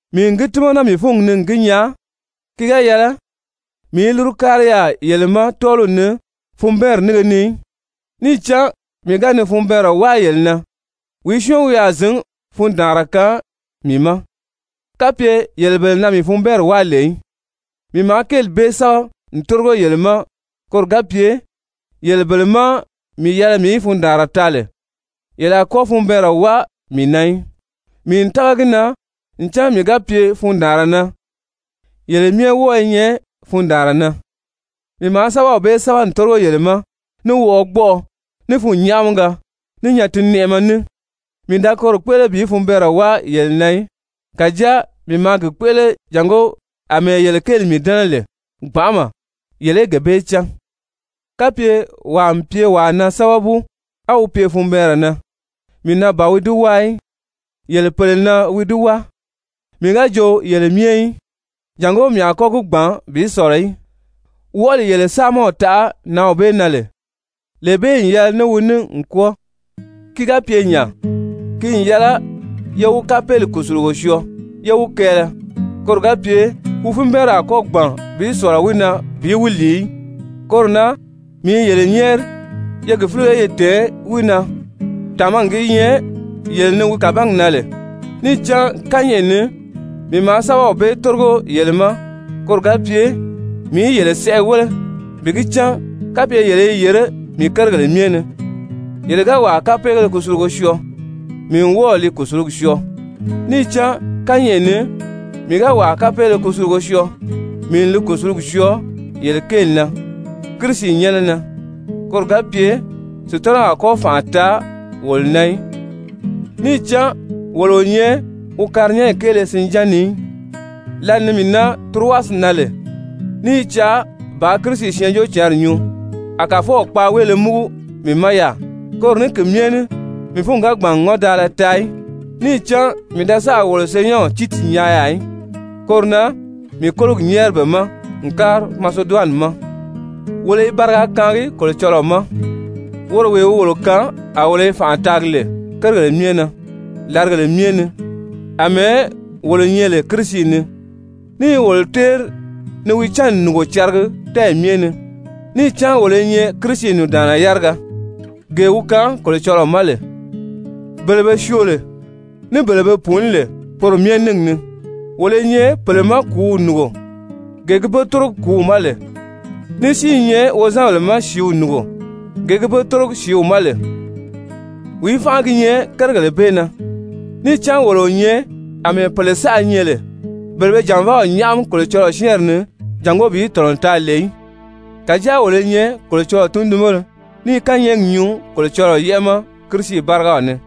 Mii n gi tímana mii fúngi ni n gi nyaa, ki ga yɛlɛ mii í lúru kári yaà yele ma tɔ́ɔliw ni funbɛɛnri nínge ni í. Níì cán mii ga ni funbɛɛnri wáa yele na, wìí syɔ́ɔn wi a zǐn fundaanra kaan mii ma, kapye yele bele na mii funbɛɛnri wáa lè í? Mii maa kéeli bee sɛ́bɛ n tórigo yele ma, koro ga pye yele bele má mii yɛlɛ mii í fundaanra taa lè, yele a kɔ́ funbɛɛnrɛ wáa mii na í. Mii n tága gi na ncan mii ga pye fundaanra na, yele myɛ wɔ́ɔ i nyɛ fundaanra na. Mii maa sɛ́bɛw bee sɛ́bɛ n tórigo yele ma ní wɔʔɔgbɔʔɔ, ní fûnnyaʔamiga, ní nyatinnɛʔɛmɛ ní, mii da koro kpéʔele bi funbɛɛnrɛ wáa yele na í, kàjáa mii maa gi kpéʔele jàngó àmɛɛ yele kéeli mii dɛ́nɛ lè gbanʔama, yele í gee bee cán. Kapye wàa n pye wàa na sábabu á wi pye funbɛɛnrɛ na, mii na ban wi di wáa í, yele pèle na wi di wáa, mii ga jo yele myɛ í, jàngó mii a kɔ́ gi gbàn bi sɔ̀lɔ í. Wɔʔɔli yele saamaw taʔa nǎnw bee na lè, lee bee n yɛlɛ ní wi ní n kwɔ́ɔ. Ki ga pye nya, ki n yɛlɛ ye wi kapeeli kùsulugo syɔɔ yé wi kɛɛlɛ, koro ga pye wi funbɛɛnri a kɔ́ gbàn bi sɔ̀lɔ wi na bi wi lìi í. Koro na mii i yele nyɛ́ɛri ye gi fílige ye tɛ̀ɛn wi na, tàmagi gi nyɛ yele ni wi kabangi na lè. Níì cán kányɛʔɛ ni mii maa sɛ́bɛw bee tórigo yele ma, koro ga pye mii í yele sɛʔɛ wéle bi gi cán kapye yele i yèré mii kérigèle myɛ ni. Yele ga wàa kapeele kusulugo syɔɔ, mii n wɔ́ɔ li kùsulugi syɔɔ. Níì cán kányɛʔɛ ni mii ga wàa kapeele kusulugo syɔɔ, mii n li kùsulugi syɔɔ yele kéeli na Kirisi nyɛ́nɛ na, koro ga pye Sutanaw a kɔ́ fànʔa taa wolo na í, níì cán wolo o nyɛ wi karinyanyi kéele sinján ni í. Lǎli ni mii nan Turowasi na lè, ní i caa bàā Kirisi Syɛɛnjóocǎnri nyuu, a Kàfɔw kpaaweele múgu mii ma yaà, koro ní ki myɛ ní mii fúngi ga gbàn n ŋɔ́ndaala taa í, níì cán mii da sáà wolo senyɛnw Tiiti nyaa yaà í. Koro na mii kólogi nyɛ́ɛri be ma n kári Maseduwani ma. Wolo i bariga kaangi Kolocɔlɔɔ ma, woro wee wi wolo kaan a wolo i fànʔa taagi lè kérigèle na làrigèle myɛ ni àmɛɛ wolo nyɛ lè Kirisi ni, ní i wolo téeri ni wi cánni nùngo caragi tɛ́ɛyi myɛ ni. Níì cán wolo i nyɛ Kirisi nùndaanna yáriga, gee wi kaan Kolocɔlɔɔ ma lè, bele be syoo lè ní bele be pùuní lè, poro myɛ níngi ni. Wolo i nyɛ pèle ma kùúw nùngo, gee gi be tórogi kùúw ma lè, ní si i nyɛ wozanbèle ma sìíw nùngo, gee gi be tórogi sìíw ma lè. Wìí fánʔa gi nyɛ kérigèle bee na? Níì cán wolo o nyɛ àmɛɛ pèle saʔa nyɛ lè, bele be jànvaaw nyáʔami Kolocɔlɔɔ syɛ́ɛnri ni jàngó bi tɔ̀nɔ taa lè í, kàjáa wolo i nyɛ Kolocɔlɔɔ tundunbéle ní i kányɛɛgi nyuu Kolocɔlɔɔ yɛ́ʔɛ ma Kirisi bárigaw ni.